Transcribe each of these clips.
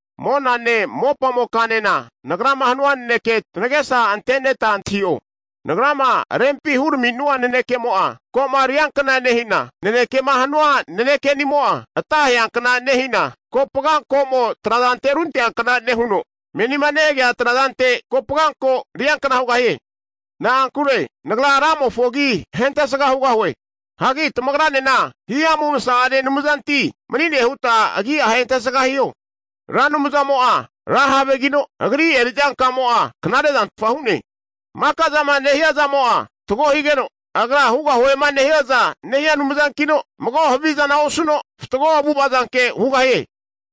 Monane mopamokanena, nagrama hanua nanekea tanagesa anteneta antahi'o. Nagrama rempima hurami'nua nanekemo'a, ko'ma riankna nehina, nanekema hanua naneke'nimo'a, ata aheankna nehina, kopaga ko'mo trazante runteankna nehuno, menima nehagea trazante kopaganko riankna hugahie. Na'ankure nagra Ramofo agi ahentesga hugahue. Hagi tamagranena himamu masa'ane Anumzanti mani'ne huta agi'a ahentesga hiho. Ra Anumzamo'a ra havegino, Agri eri'zankamo'a knarezantfa hu'ne. Maka'zama nehia zamo'a fatgo higeno, Agra hugahuema nehiaza nehia Anumzankino, mago havizana osuno, fatgo avu'ava zanke hugahie.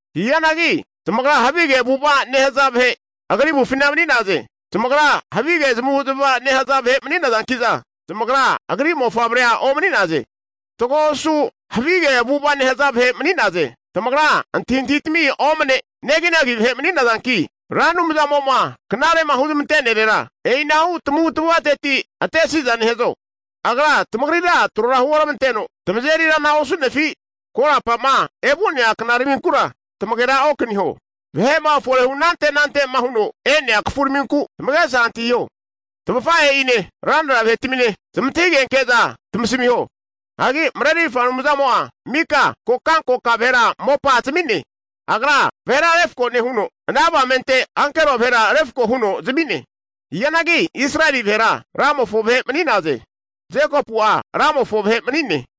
Hianagi zamagra havige avu'ava nehaza vahe agri avufina mani'naze. Zamagra havige zamavu'zamava nehaza vahe mani'nazanki'za zamagra agri mofavrea omani'naze. Fatgo osu havige avu'ava nehaza vahe mani'naze. Tamagra antahintahitami omne neginagi vahe mani'nazanki, Ra Anumzamo'ma knare'ma huramante'nerera e'inahu tamavu'tamavateti atesi'za nehazo? Agra tamagrira trora huoramanteno, tamazeri rana osu'nefi? Korapa'ma evu'nea knaraminkura tamagera okaniho. Vahe'ma forehu anante anante'ma huno e'nea kafuraminku tamagesa antahiho. Tamafahe'ine, ranra vahe'tamine zamantahigenke'za tamasamiho. Hagi Marerirfa Anumzamo'a mika kokankoka vahera mopa zami'ne. Agra vahera refko nehuno, ana avamente ankero vahera refako huno zami'ne. Hianagi Israeli vahera Ramofo vahe mani'naze. Jekopu'a Ramofo vahe mani'ne.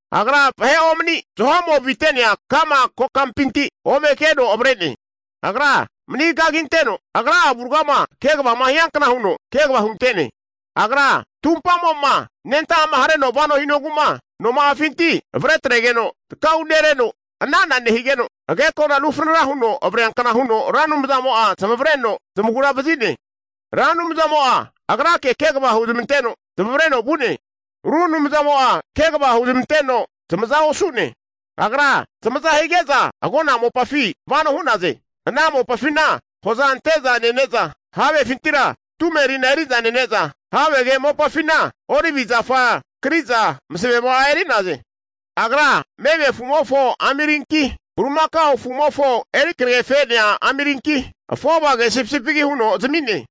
Agra vahe'omani zaho'mo avite'nea ka'ma kokampinti ome keno avre'ne. Agra mani kaginteno, Agra'a avuragama kegavama hiankna huno kegava hunte'ne. Agra tumpamo'ma anenta'ama hareno vano hinogu'ma noma'afinti avretregeno taka'unereno ana'ana nehigeno agekona rufranara huno avreankna huno Ra Anumzamo'a zamavareno zamagura vazi'ne. Ra Anumzamo agrake kegava huzmanteno, zamavareno vu'ne. Ru anumzamo'a kegava huzmanteno zamaza osu'ne. Agra zamaza hige'za agona mopafi vano hu'naze. Ana mopafina hoza ante'za nene'za, havefintira tumerina eri'za nene'za, havege mopafina olivi zafa kri'za masavema'a eri'naze. Agra meme afu'mofo amirinki, bulimakao afu'mofo eri kregefe'nea amirinki, afovage sipisipigi huno zami'ne.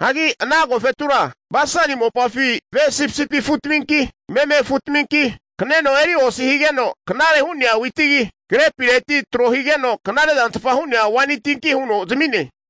Hagi ana agofetura Basani mopafi ve sipisipi afu'taminki, meme afu'taminki, kaneno eri osi higeno knare hu'nea witigi, grepireti tro higeno knare'zantfa hu'nea waini tinki huno zami'ne.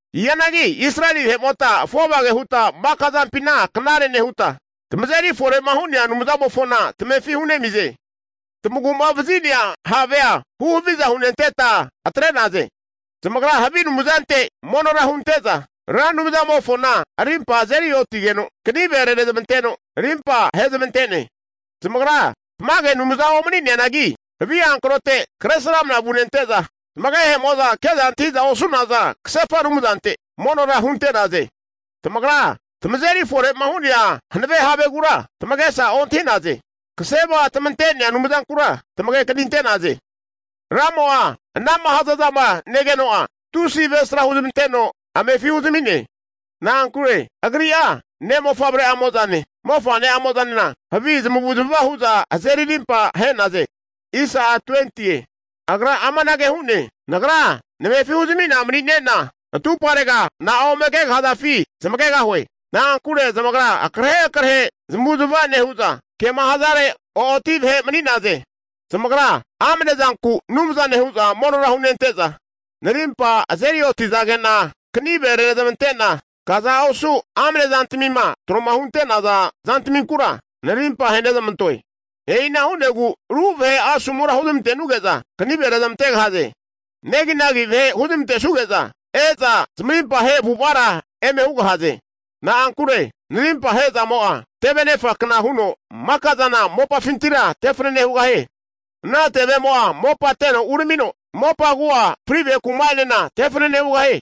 Hianagi Israeli vahe'mota afovage huta maka zampina knare nehuta, tamazeri fore'ma hu'nea Anumzamofona tamefi hunemize. Tamagu'ma vazi'nea Havea huhaviza hunenteta atre'naze. Zamagra havi anumzantminte monora hunte'za Ra Anumzamofona arimpa azeri oti'zageno, kanive renezmanteno rimpa ahezmante'ne. Zamagra tamage anumzana omani'neanangi, havi hankrote kresramana vunente'za, zamagehe'mo'za ke'za antahi'za osu'naza kasefa anumzante monora hunte'naze. Tamagra tamazeri fore'ma hu'nea hanave Havegura tamagesa ontahi'naze. Kasema tamante'nea Anumzankura tamagekaninte'naze. Ramo'a anama hazazama negeno'a, tusi avesra huzmanteno amefi huzami'ne. Na'ankure Agri'a ne'mofavre'amozane mofane'amozanena havi zamavu'zmava hu'za azeri rimpa ahe'naze. Agra amanage hu'ne, Nagra namefi huzami'na mani'nena atuparega na'a ome kegahazafi zamagegahue. Na'ankure zamagra akrahe akrahu zamavu'zmava nehu'za, kema hazare o'oti vahe mani'naze. Zamagra amnezanku anumzane hu'za monora hunente'za, narimpa azeri oti'zage'na, kanive renezamante'na, kaza osu amnezantamima tro hunte'naza zantaminkura narimpa ahenezamantoe. E'ina hu'negu ru vahe asomura huzmantenuge'za kanive rezmantegahaze. Neginagi vahe huzmante'suge'za e'za, zamarimpa ahe avu'avara eme hugahaze. Na'ankure narimpahe zamo'a, tevenefa kna huno maka'zana mopafintira tefanane hugahie. Ana tevemo'a mopa teno uramino mopa agu'a fri' vahe kuma'enena tefanane hugahie.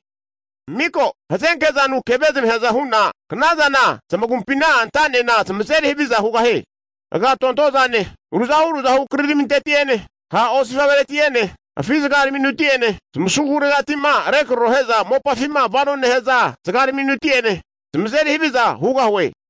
Miko hazenkezanu keve zamaheaza hu'na knazana zamagumpina anta'nena zamazeri haviza hugahie. Agatontozane, ruzahu ruzahu kriraminteti'ene ha' osifavereti'ene, afi' zagaraminuti'ene, zmasaguregati'ma regraro he'za mopafima vanoma nehaza zagaraminuti'ene, zamazeri haviza hugahue.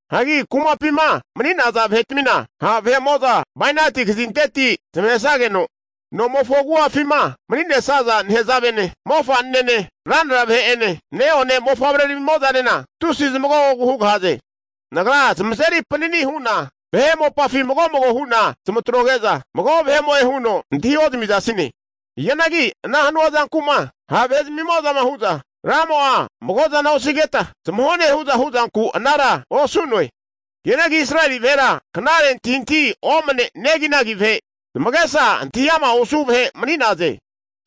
Hagi kumapima mani'naza vahe'tmina ha' vahe'mo'za bainati kazinteti zamahesageno, nomofo agu'afima mani'nesaza nehazavene, mofa'nene ranra vahe'ene ne'one mofavremo'zanena tusi zamagogogu hugahaze. Nagra zamazeri panani hu'na vahe mopafi mago mago hu'na zamatroge'za, mago vahe'mo'e huno antahi ozamizasine. Hianagi ana hanua zanku'ma ha' vahe zamimo'zama hu'za, Ra Anumzamo'a mago zana osigeta zamahone hu'za hu'zanku, anara osu'noe. Hianagi Israeli vahera knare antahintahi omne neginagi vahe, zamagesa antahi ama' osu vahe mani'naze.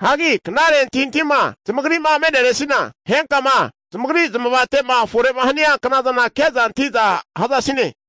Hagi knare antahintahima zamagri'ma me'neresina, henkama zamagri zamavate'ma fore'ma hania knazana ke'za antahi'za hazasine.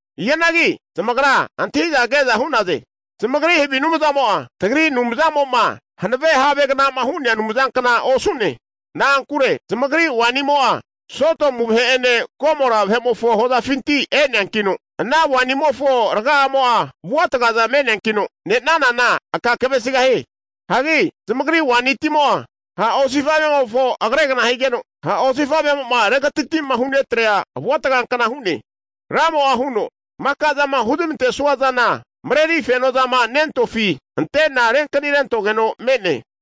Hianagi zamagra antahi'za ke'za hu'naze, zamagri havi anumzamo'a, tagri Anumzama hanave Havegna'ma hu'nea Anumzankna osu'ne. Na'ankure zamagri wainimo'a Sodomu vahe'ene, Gomora vahe'mofo hozafinti e'neankino, ana wainimofo raga'amo'a avuatagaza me'neankino, ne'nanana aka kavesigahie. Hagi zamagri waini timo'a ha' osifa'vemofo agregna higeno, ha' osifa'vemo'ma regatatima hunetrea avua tagankna hu'ne. Ra Anumzamo'a huno, Maka'zama huzmantesua zana mareri fenoma nentofi ante'na renkanirentogeno me'ne.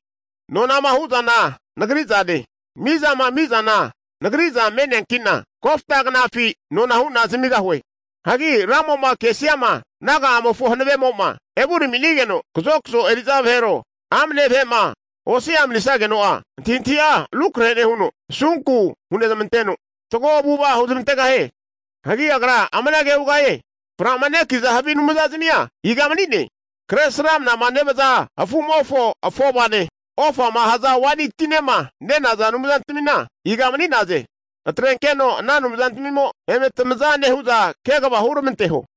Nonama hu'zana Nagri zane, mizama ami'zana Nagri'za me'neanki'na, kofta knafi nona hu'na zamigahue. Hagi Ra Anumzamo'ma kesiama naga'amofo hanavemo'ma evurami'nigeno kazokazo eri'za vahero, amne vahe'ma osia manisageno'a, antahintahi'a rukrahe nehuno, asunku hunezamanteno fatgo avu'ava huzmantegahie. Hagi Agra amanage hugahie, fra'maneki'za havi anumzazimia iga mani'ne? Kre sramnama nevaza afu'mofo afovane, ofama haza waini tinema nenaza anumzantmina iga mani'naze? Atrenkeno ana anumzantmimo eme tamaza nehu'za kegava huramanteho!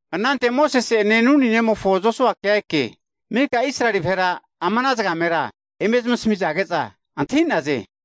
Anante Mosese'ene Nuni nemofo Josuakea eke, mika Israeli vahera ama ana zagamera eme zamasamizage'za antahi'naze.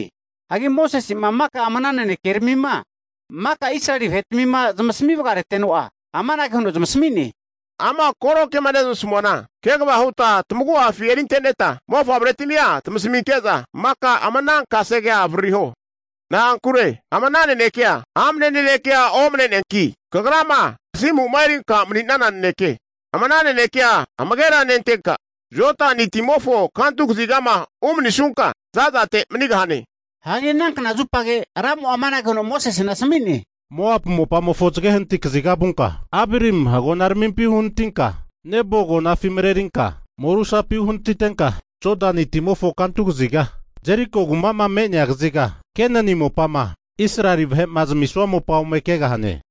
Hagi Mosese'ma, maka ama ana nanekeramima maka Israeli vahe'tmima zamasami vagareteno'a, amanage huno zamasami'ne, ama koro kema neramasamuana kegava huta tamagu'afi erinte'neta mofavretimia zamasaminke'za maka ama ana kasegea avaririho. Na'ankure ama ana nanekea amne nanekea omne'neanki, kagrama kasimu'ma erinka mani'nana naneke. Ama ana naneke amagera nentenka Jodani timofo kantu kazigama umanisunka za'zatera manigahane. Hagi ana kna zupage Ra Anumzamo'a amanage huno Mosesena asami'ne, Moapu mopamofo zage hanati kaziga vunka, Abarim agonaramimpi uhanatinka, Nebo agonafi marerinka morusapi uhanatitenka, Jodani timofo kantu kaziga Jeriko kuma'ma me'nea kaziga Kenani mopama Israeli vahe'ma zamisua mopa ome kegahane.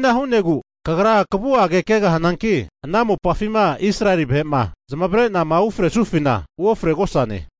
E'ina hu'negu kagra kavu'age kegahananki, ana mopafima Israeli vahe'ma zamavare'nama ufresufina uofregosane.